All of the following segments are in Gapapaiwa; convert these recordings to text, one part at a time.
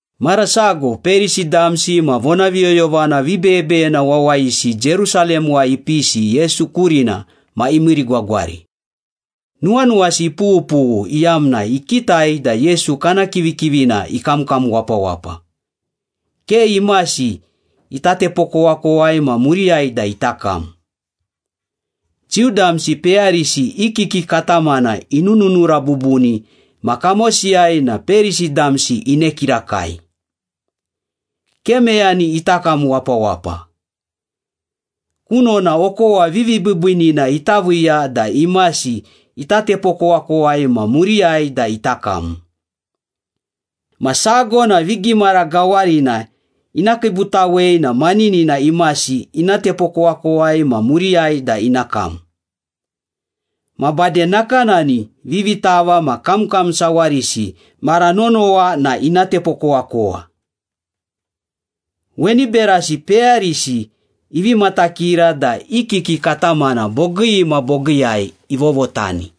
Mara sago Perisi damsi ma vonaviyoyovana vibeyebeyena wawayisi Jerusalemuwai ipisi Yesu kurina ma imiirigwagwari. Nuwanuwasi ipughupughu iyamna ikitai da Yesu kana kivikivina ikamkam wapawapa, ke imasi ita tepokowakowai ma muriyai da ita kam. Jiu damsi peyarisi i kiki katamana inununura bubuni ma kamosiyai na Perisi damsi ine kirakai. Ke meyani ita kam wapawapa. Kunona okowa vivibiibiinina ita viiya da imasi ita tepokowakowai ma muriyai da ita kam. Ma sago na vigimara gawarina ina kiibutawei na maninina imasi ina tepokowakowai ma muriyai da ina kam. Ma bade nakanani vivitava ma kamkam sawarisi mara nonowa na ina tepokowakowa. Weni berasi peyarisi ivi matakira da i kiki katamana bogii ma bogiiyai ivovotani.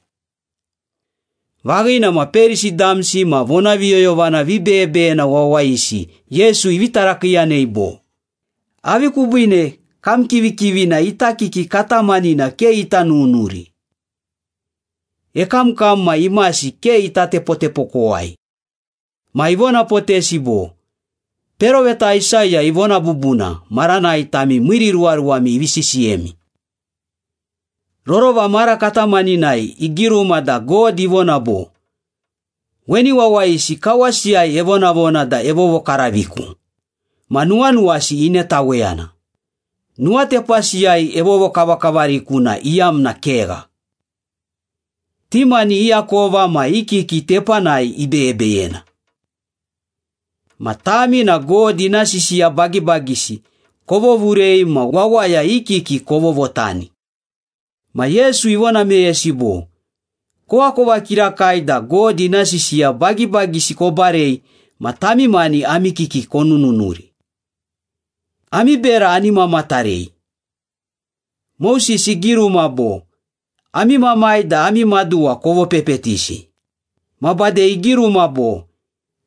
Vaghina ma Perisi damsi ma vonaviyoyovana vibeyebeyena wawayisi Yesu ivi tarakiiyanei bo, “Avi kubiine kam kivikivina ita kiki katamanina ke ita nunuri? Ekamkam ma imasi ke ita tepotepokowai.” Ma ivonapotesi bo, “Peroveta Aisaya ivona bubuna maranai tami miiriruwaruwami ivi sisiyemi. Rorova mara katamaninai igiruma da God ivona bo, ‘Weni wawayisi kawasiyai evonavona da evovokaraviku, Ma nuwanuwasi inetaweyana, Nuwatepasiyai evovokavakavariku na iyamna kegha. Ti mani i akova ma i kiki tepanai ibeyebeyena.’” “Ma tami na God ina sisiya bagibagisi kovovurei ma wawaya i kiki kovovotani.” Ma Yesu ivona meyesi bo, “Koakova kirakai da God ina sisiya bagibagisi kobarei ma tami mani ami kiki konununuri! Ami bera ani mamatarei. Moses igiruma bo, ‘Ami mamai da ami maduwa kovopepetisi.’ ma bade igiruma bo,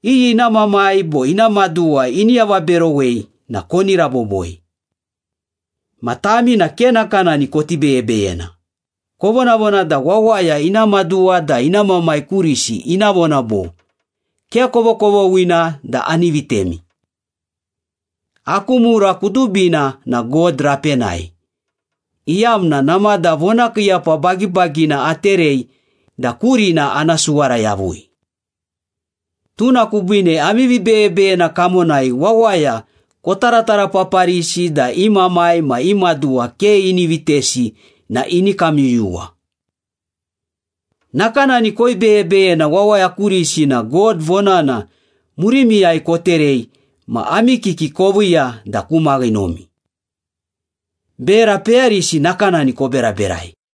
‘Iyi ina mamai bo ina maduwa ini avaberowei na koni raboboi.’ Ma tami na ke nakanani koti beyebeyena, kovonavona da wawaya ina maduwa da ina mamai kurisi ina vona bo, ‘Ke kovokovoghina da ani vitemi. Aku mura kudubina na God rapenai, iyamna namada vonakiiyapa bagibagina aterei da kurina ana suwara yavui.’ Tuna kubiine ami vibeyebeyena kamonai wawaya kotaratarapaparisi da i mamai ma i maduwa ke ini vitesi na ini kamyuyuwa. Nakanani koibeyebeyena wawaya kurisi na God vonana murimiyai koterei ma ami kiki koviiya da ku maghinomi. Bera peyarisi nakanani koberaberai.”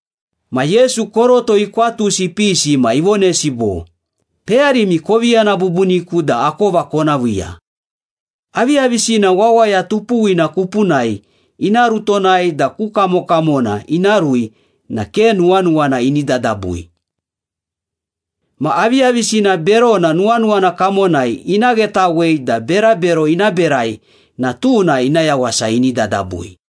Ma Yesu koroto ikwatusi ipisi ma ivonesi bo, “Peyarimi, kovi yana bubuniku da akova kona viiya. Aviyavisina wawaya tupuwina kupunai ina rutonai da ku kamokamona ina rui na ke nuwanuwana ini dadabui. Ma aviyavisina berona nuwanuwana kamonai ina ghetawei da berabero ina berai na tuna ina yawasa ini dadabui.”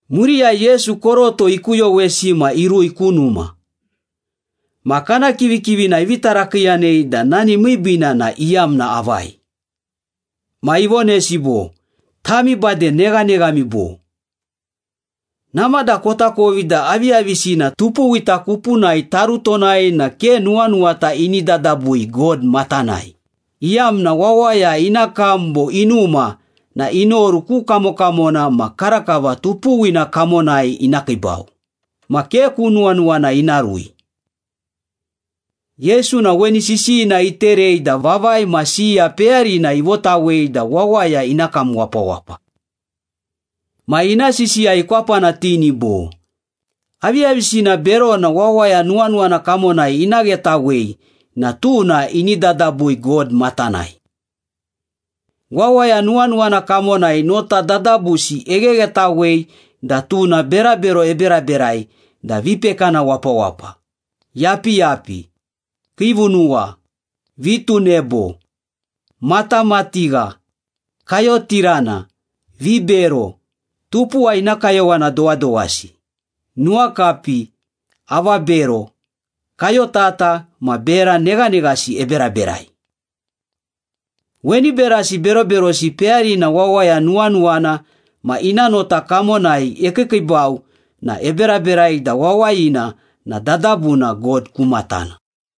Muriyai Yesu koroto ikuyowesi ma irui ku numa. Ma kana kivikivina ivi tarakiiyanei da nani miibiina na iyamna avai. Ma ivonesi bo, “Tami bade neghaneghami, bo? Namada kotakovi da aviyavisina tupuwita kupunai tarutonai na ke nuwanuwata ini dadabui God matanai, iyamna wawaya ina kam bo inuma na inoru ku kamokamona ma karakava tupuwina kamonai ina kiibau, ma ke ku nuwanuwana ina rui.” Yesu na weni sisiyina iterei da vavai ma siya peyarina ivotawei da wawaya ina kam wapawapa. Ma ina sisiya ikwapanatini bo, “Aviyavisina berona wawaya nuwanuwana kamonai ina ghetawei na tuna ini dadabui God matanai. Wawaya nuwanuwana kamonai nota dadabusi egheghetawei da tuna berabero eberaberai da vipekana wapawapa, yapiyapi, kiivunuwa, vitunebo, matamatigha, kayotirana, vibero, tupuwa ina kayowana dowadowasi, nuwakapi, avabero, kayotata ma bera neghaneghasi eberaberai. Weni berasi beroberosi peyarina wawaya nuwanuwana ma ina nota kamonai ekiikiibau na eberaberai da wawayina na dadabuna God ku matana.”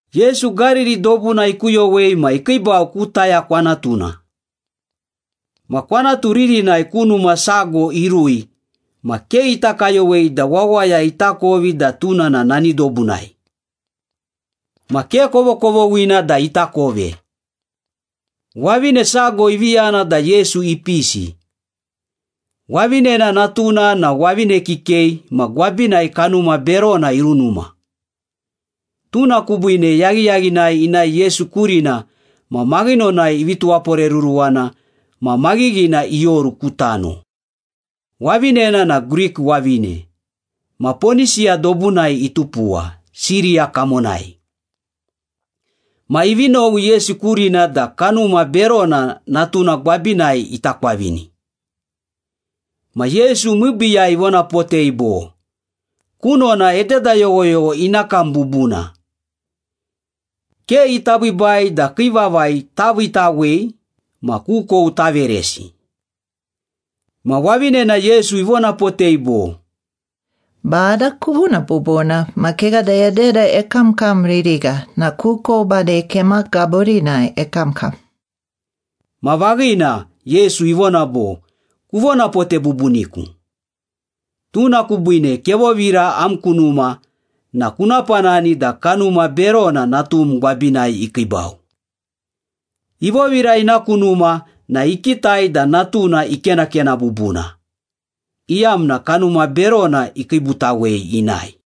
Yesu Gariri dobuna ikuyowei ma ikiibau ku Taya kwanatuna. Ma kwanatu ririnai ku numa sago irui ma ke ita kayowei da wawaya itakovi da tuna na nani dobunai. Ma ke kovokovoghina da ita kove. Wavine sago ivi yana da Yesu ipisi. Wavinena natuna na wavine kikei ma gwabinai kanuma berona irunuma. Tuna kubiine yaghiyaghinai inae Yesu kurina ma maghinonai ivi tuwaporeruruwana ma maghighina ioru ku tano. Wavinena na Grik wavine, ma Ponisiya dobunai itupuwa, Siriya kamonai. Ma ivi nowi Yesu kurina da kanuma berona natuna gwabinai ita kwavini. Ma Yesu miibiiyai ivonapotei bo, “Kunona ededa yoghoyogho ina kam bubuna. Ke ita biibai da kii vavai taviitawei ma kukou taveresi.” Ma wavinena Yesu ivonapotei bo, “Bada, kuvona bubuna, ma kegha da ededa ekamkam ririgha na kukou bade kema gaburinai ekamkam.” Ma vaghina, Yesu ivona bo, “Kuvonapote bubuniku. Tuna kubiine kevovira am ku numa na kuna panani da kanuma berona natum gwabinai ikiibau.” Ivovira ina ku numa na ikitai da natuna ikenakena bubuna, iyamna kanuma berona ikiibutawei inae.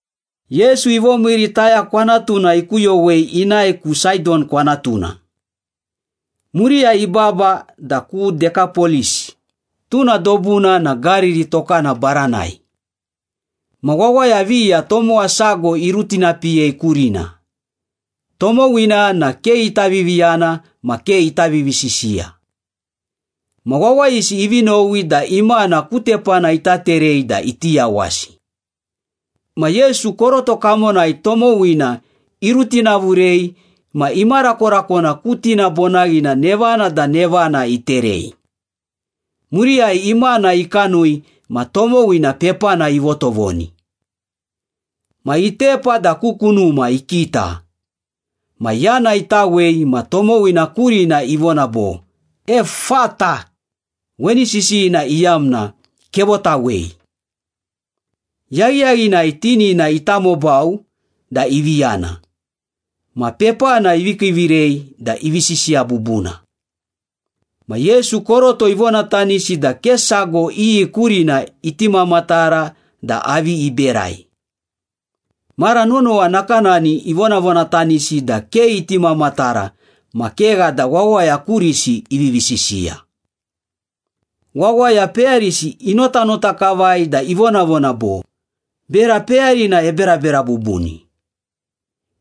Yesu ivomiiri Taya kwanatuna ikuyowei inae ku Saidon kwanatuna. Muriyai ibaba da ku Dekapolis, tuna dobuna na Gariri tokana baranai. Ma wawaya viya tomowa sago irutinapiyei kurina, tomowina na ke ita viviyana ma ke ita vivisisiya. Ma wawayisi ivi nowi da imana ku tepana ita terei da iti yawasi. Ma Yesu koroto kamonai tomowina irutinavurei ma imarakorakona ku tinabonaghina nevana da nevana iterei. Muriyai imana ikanui ma tomowina pepana ivotovoni. Ma itepa da ku kunuma ikita. Ma yana itawei ma tomowina kurina ivona bo, Ephphatha, weni sisiyina iyamna ‘Kevotawei.’ Yaghiyaghinai tinina itamobau da ivi yana, ma pepana ivi kiivirei da ivi sisiya bubuna. Ma Yesu koroto ivonatanisi da ke sago iyi kurina iti mamatara da avi iberai. Mara nonowa nakanani ivonavonatanisi da ke iti mamatara ma kegha da wawaya kurisi ivivi sisiya. Wawaya peyarisi inotanota kavai da ivonavona bo, “Bera peyarina eberabera bubuni!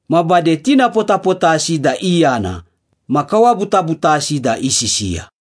Ma bade tinapotapotasi da iyana ma kawabutabutasi da isisiya!”